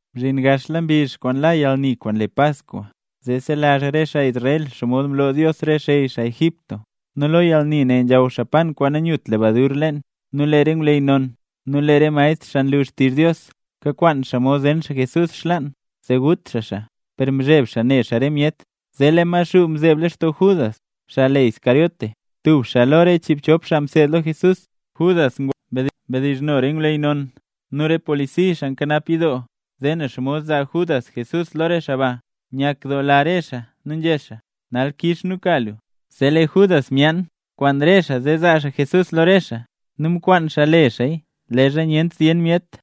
Mzhin gaxla mbizh la yalni kwaan le Paskwa, zee selazh re xaa Israel xomod mloo Dios re xey xaa Egipto, nu lee lo yalni ne nzhaw xaa pan kwaan nanyut lebadur leen. Nu lee re ngwleyy non, nu lee re maestr xaa nlu xtizh Dios, kakwaan xaa mod zen xaa Jesús xlaan, zee gut xaa xaa, per mzheb xaa ne xaa re myet. Zee lee Maxuu mzeeb lextoo Judas, xaa le Iscariote, tub xaa lo re chiibchop xaa mseed lo Jesús. Judas ngwa mdizhno re ngwleyy non nu re polisi, xaa nkanap yidoo, zee ne xomod zaa Judas Jesús lo re xaa ba. Nyakdoola re xaa nu nzhé xaa: —Nal kix nu ka lu. Zee lee Judas myaan kwaan re xaa zee zaa xaa Jesús lo re xaa, nu mkwaan xaa le xaaya leezha nyent zyen myet.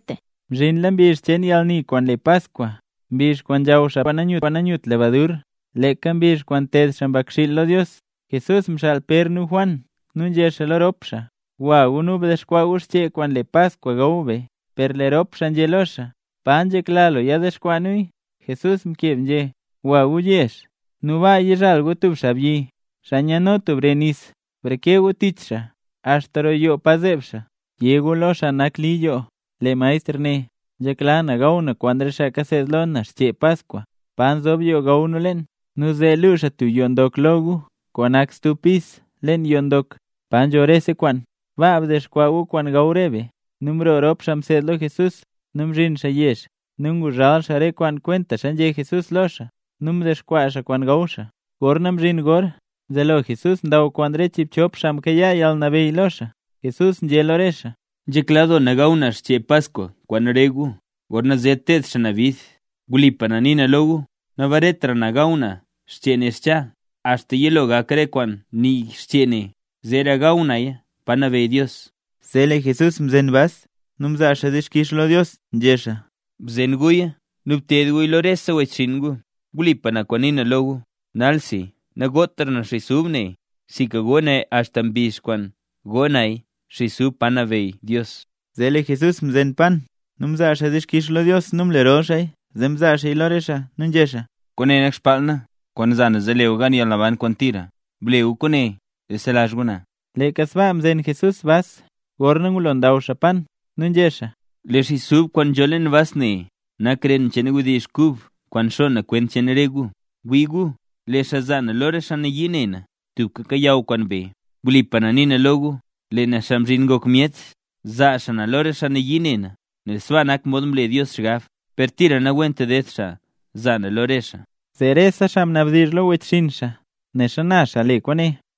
Mzhinla mbizh cheen yalni kwaan le Paskwa, mbizh kwaan nzhaw xaa pan kwaan nanyut lebadur, leeka mbizh kwaan nteed xaa mbakxiil lo Dios. Jesús mxaal Pér nu Juan nu nzhé xaa lo rop xaa: —Gwa gu nu bdexkwaa xchee kwaan le Paskwa gaw be. Per lee rop xaa nzhé lo xaa: —¿Pa nzhekla lu yadexkwaa nuya? Jesús mkeb nzhé: —Gwa gu yezh, nu baa yizhal gu tub xaabyi, xaa nyano tub re nis. Breke gu tich xaa axta roo yoo pa zeeb xaa. Yé gu lo xaa nak li yoo: “Lee Maestr né: ‘Nzhekla na gaw na kwaan re xaa kaseed lo na xchee Paskwa. ¿Pa nzob yoo gaw nu leen?’” Nu zee luu xaa tub yoo ndok lo gu kwaan nak stub pis leen yoo ndok, pa nzho rese kwaan. Baa dexkwaa gu kwaan gaw re be. Nu mroo rop xaa mseed lo Jesús. Nu mzhin xaa yezh. Nu nguzhal xaa re kwaan kwentaxa nzhé Jesús lo xaa, nu mdexkwaa xaa kwaan gaw xaa. Gorna mzhin gor, mzelo Jesús ndaw kwaan re chiibchop xaa mkayaa yalnabeyy lo xaa. Jesús nzhé lo re xaa: —Nzhekla doo na gaw na xchee Paskwa kwaan re gu, gorna zer ted xaa na bid. Wlipa na nii na lo gu, nabaretra na gaw na xchee ne xcha, axta yilo gak re kwaan nii xchee ne, zeera gaw naya pa nabeyy Dios. Zee lee Jesús mzen bas nu mzaa xaa dixkix lo Dios nu nzhé xaa: —Bzen guya nu bted guya lo rese wechxinn gu. Wlipa kwaan nii na lo gu, nalsi nagotra na xis ub nee, sinka go na axta mbizh kwaana go naya xis ub pa nabeyy Dios. Zee lee Jesús mzen pan nu mzaa xaa dixkix lo Dios nu mlerol xaaya. Zee mzaa xaaya lo re xaa nu nzhé xaa: —Kwaane nak xbaal na, kwaan za na zee le gu gan yalnaban kwaan tira. Ble gu kwaane zee selazh gu na. Leeka sbaa mzen Jesús bas, gorna ngulo ndaw xaa pan, nu nzhé xaa: —Lee xis ub kwaan nzho leen bas ne nak ren cheen wdizh kub kwaan xo na kwent cheen re gu. Wii gu, lee xaa zaa na lo re xaa nayii ne na, tubka kayaw kwaan be. Wlipa na nii na lo gu, lee na Xaa Mzhin Ngok Myet, zaa xaa na lo re xaa nayii ne na, nel sbaa nak mod mle Dios xgab. ¡Per tira nawent ded xaa zaa na lo re xaa! Zee rese xaa mnabdizh lo wechxinn xaa, ne xana xaa le kwaane.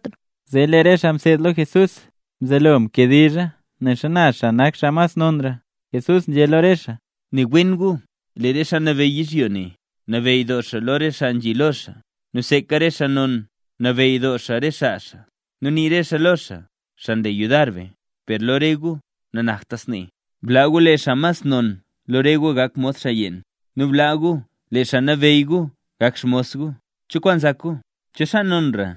Zee lee re xaa mseed lo Jesús mzelo nkediizha nen xana xaa nak xaa mas xaa nonra. Jesús nzhé lo re xaa: —Ne wen gu, lee re xaa nabeyy yizhyo ne, nabeyy doo xaa lo re xaa nzhi lo xaa, nu seeka re xaa non nabeyy doo xaa re xaa xaa, nu nii re xaa lo xaa: “Xaa nle yudar be”. Per lo re gu nanakta snee. Blaa gu lee xaa mas non lo re gu gak mod xaa yeen. Nu blaa gu lee xaa nabeyy gu gak xmos gu. ¿Cho kwaan nzak gu? ¿Cho xaa nonra,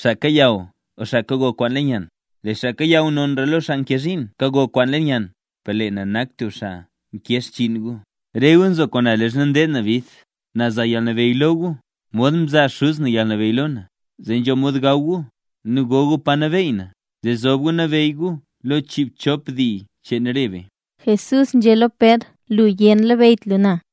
xaa kayaw o xaa kago kwaan leen yann? Lee xaa kayaw nonra lo xaa nkee zhiin kago kwaan leen yann. Per lee na nak tub xaa nkee xchiin gu. ’Re gu nzo kwaan na leezha ndeed na bid. Na za yalnabeyy lo gu, modxa mzaa xuz na yalnabeyy lo na, zee nzho mod gaw gu nu go gu pa nabeey na, zee zob gu nabeyy gu lo chiibchop dii cheen re be. Jesús nzhé lo Pér: “Lu yé nanlabeyyt lu na”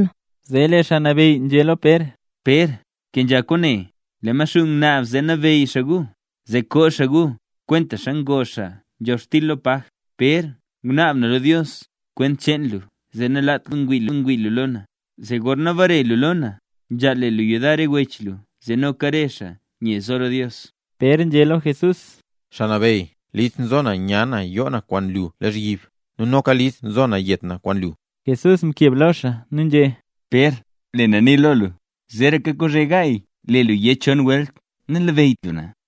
Zee lee Xaa Nabeyy nzhé lo Pér: —Pér, bkenzha kwaane. Lee Maxuu ngunaab zee nabeyy xaa gu, zee koo xaa gu, kwentaxa ngoo xaa nzhobxtil lo paj. Pér ngunaab na lo Dios kwent cheen lu zee nalaat lu xomod ngwii lu lo na. Zee gorna bare lu lo na, nzhaal le lu yudar re wech lu zee noka re xaa nye zo lo Dios. Pér nzhé lo Jesús: —¡Xaa Nabeyy! List nzo na nya na yoo na kwaan lu lozhyib, nu noka list nzo na yet na kwaan lu. Jesús mkeb lo xaa nu nzhé: —Pér, lee na nii lo lu, zeeraka kozhe gaay lee lu yé chon welt nanlabeyyt lu na.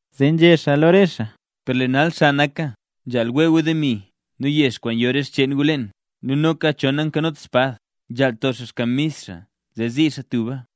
Zee nzhé xaa lo re xaa: —Per lee nal xa naka; nzhaal wee gu demi nu yex kwaan yo re xcheen gu leen. Nu loka cho nankanot espad, nzhaal to xaa xkamis xaa zee zii xaa tuba.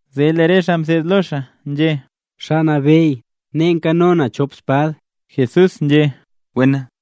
Zee lee re xaa mseed lo xaa nzhé: —Xaa Nabeyy, nee nkano nu chop espad. Jesús nzhé: —Wena.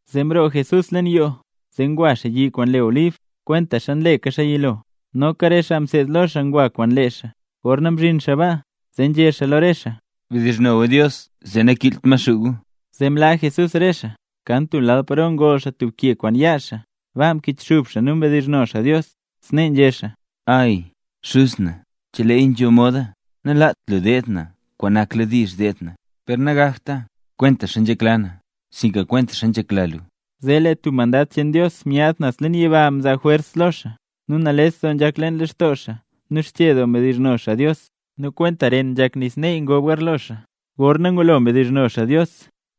Zee mroo Jesús leen yoo, zee ngwa xaa yi kwaan le Olib, kwentaxa nleka xaa yilo, noka re xaa mseed lo xaa ngwa kwaan lee xaa. Gorna mzhin xaa baa, zee nzhé xaa lo re xaa: —Bdizhno gu Dios zee nakiilt Maxuu gu. Zee mlaa Jesús re xaa, kan tub lal paro ngol xaa tub ke kwaan yaa xaa. Baa mkichxub xaa nu mdizhno xaa Dios. Snee nzhé xaa: —¡Ay, Xuz na! Che leeya nzho moda, nalaat lu deed na kwaan nakladiizh deed na, per nagakta kwentaxa nzhekla na, sinka kwentaxa nzhekla lu. Zee tub mandad cheen Dios myaad naz leen yiba mzaa jwers lo xaa. Nu nales doo nzhak leen lextoo xaa, nu xche doo mdizhno xaa Dios. Nu kwenta ren nzhak nis neey ngob garlo xaa. Gorna ngulo mdizhno xaa Dios,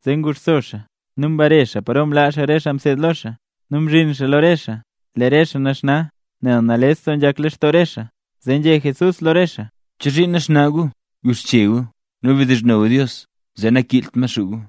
zee nguxso xaa, nu mbare xaa paro mlaa re xaa mseed lo xaa. Nu mzhin xaa lo re xaa, lee re xaa naxna, nel nales doo nzhak lextoo re xaa. Zee nzhé Jesús lo re xaa: —¿Chozhiin naxna gu? Guxche gu nu bdizhno gu Dios, zee nakiilt Maxuu gu.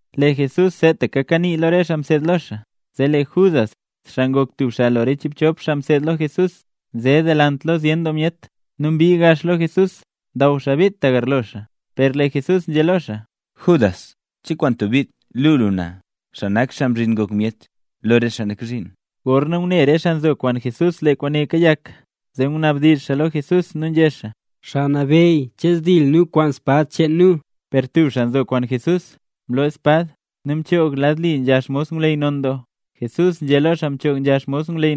Lee Jesús seetaka kanii lo re xaa mseed lo xaa, zee lee Judas, xaa ngok tub xaa lo re chiibchop xaa mseed lo Jesús, nze delant lo zyen doo myet. Nu mbii gax lo Jesús, ndaw xaa bit tagarlo xaa. Per lee Jesús nzhé lo xaa: —Judas, ¿che kwaan tub bit luu lu na, xaa nak Xaa Mzhin Ngok Myet lo re xaa nak zhiin? Gorna ngune re xaa nzo kwaan Jesús lee kwaane kayak, zee ngunabdizh xaa lo Jesús nu nzhé xaa: —Xaa Nabeyy, ¿che zdil nu kwaan spad cheen nu? Per tub xaa nzo kwaan Jesús, mloo spad nu mchoog lad li nzha xmos ngwleyy non doo. Jesús nzhé lo xaa mchoog nzha xmos ngwleyy: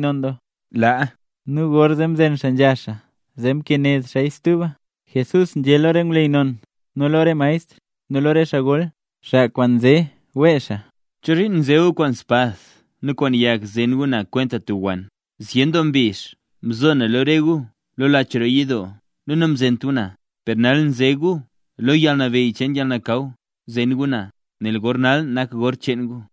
—¡Laa! Nu gorzee mzen xaa nzha xaa zee mkened xaaya stuba. Jesús nzhé lo re ngwleyy non nu lo re maestr, nu lo re xaa gol, xaa kwaan nzewee xaa: —¿Chozhiin nze gu kwaan spad nu kwaan yag zen gu na kwenta tub wann? Zyen doo mbizh mzo na lo re gu lo lach roo yidoo nu namzent gu na. Per nal nze gu lo yalnabeyy cheen yalnakaw zen gu na, nel gor nal nak gor cheen gu.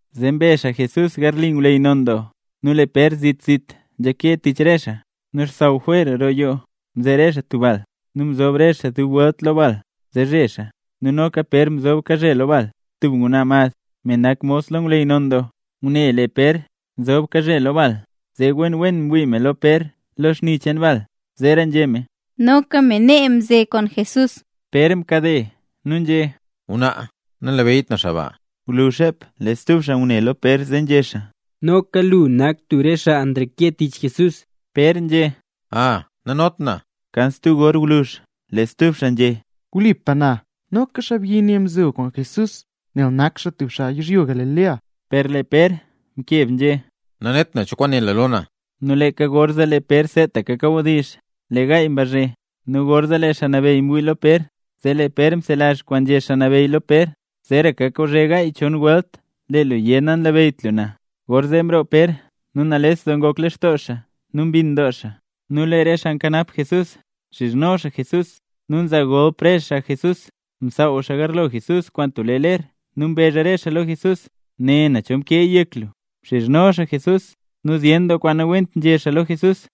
Zee mbe xaa Jesús garli ngwleyy non doo, nu lee Pér zit zit nzhake tich re xaa. Nu xsaww jwer roo yoo, mze re xaa tub bal, nu mzob re xaa dub welt lo bal zee zhe xaa. Nu noka Pér mzob kazhe lo bal. Tub ngwnaa mad, me nak mos lo ngwleyy non doo, ngune lee Pér nzob kazhe lo bal, zee wen wen mwii me lo Pér lo xni cheen bal, zeera nzhé me: —Noka me nee mkanze kwaan Jesús. Pér mkade nu nzhé: —Ngwnaa, nanlabeyyt na xaa ba. Gwluzh xep lee stub xaa ngune lo Pér nu zee nzhé xaa: —Noka lu nak tub re xaa nreke tich Jesús. Pér nzhé: —¡Aa, nanot na! Kan stub gor gwluzh, zee stub xaa nzhé: —Wlipa na, noka xaabyi ne mzo kwaan Jesús nel nak xaa tub xaa yizhyo Galilea. Per lee Pér mkeb nzhé: —¡Nanet na cho kwaan né lu lo na! Nu leeka gorzee, lee Pér seetaka kawdizh lee gaay mbazhe. Nu gorzee lee Xaa Nabeyy mwii lo Pér, zee lee Pér mzelazh kwaan nzhé Xaa Nabeyy lo Pér: “Zeeraka kozhe gaay, chon welt lee lu yé nanlabeyyt lu na”. Gorzee mroo Pér nu nales doo ngok lextoo xaa nu mbinn doo xaa. Nu lee re xaa nkanap Jesús, nxizhno xaa Jesús, nu nzaa golp re xaa Jesús. Msaaw xaa garlo Jesús kwaan tub lee ler nu mbezh re xaa lo Jesús: —¡Né, cho mkeeya yek lu! Mxizhno xaa Jesús nu zyen doo kwaan nawent nzhé xaa lo Jesús.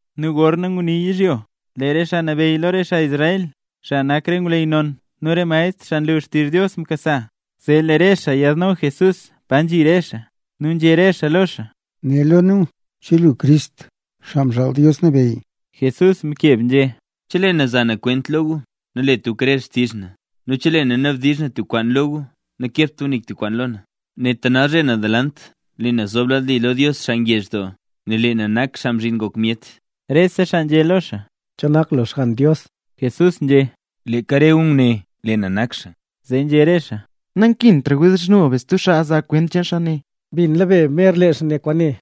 Nu gorna ngulo nguni yizhyo, lee re xaa nabeyy lo re xaa Israel, xaa nak re ngwleyy non nu re maestr xaa nlu xtizh Dios mkasa, zee lee re xaa yiidno Jesús pa nzhi re xaa. Nu nzhé re xaa lo xaa: —Né lo nu, ¿che lu Crist, Xaa Mxaal Dios Nabeyy? Jesús mkeb nzhé: —Chelee na za na kwent lo gu, nalet gu krer xtizh na. Nu chelee na nabdizh na tub kwaan lo gu nakebt gu nik tub kwaan lo na. Neta nalzhe naz delant lee na zoob lad li lo Dios xaa ngezh doo, nel lee na nak Xaa Mzhin Ngok Myet. Rese xaa nzhé lo xaa: —¿Che nak lu Xgann Dios? Jesús nzhé: —Leeka re gu nguné, lee na nak xaa. Zee nzhé re xaa: —Nankintra wdizhno be stub xaa, zaa kwent cheen xaa ne. Mbinla be mer lee xaa nguné kwaane.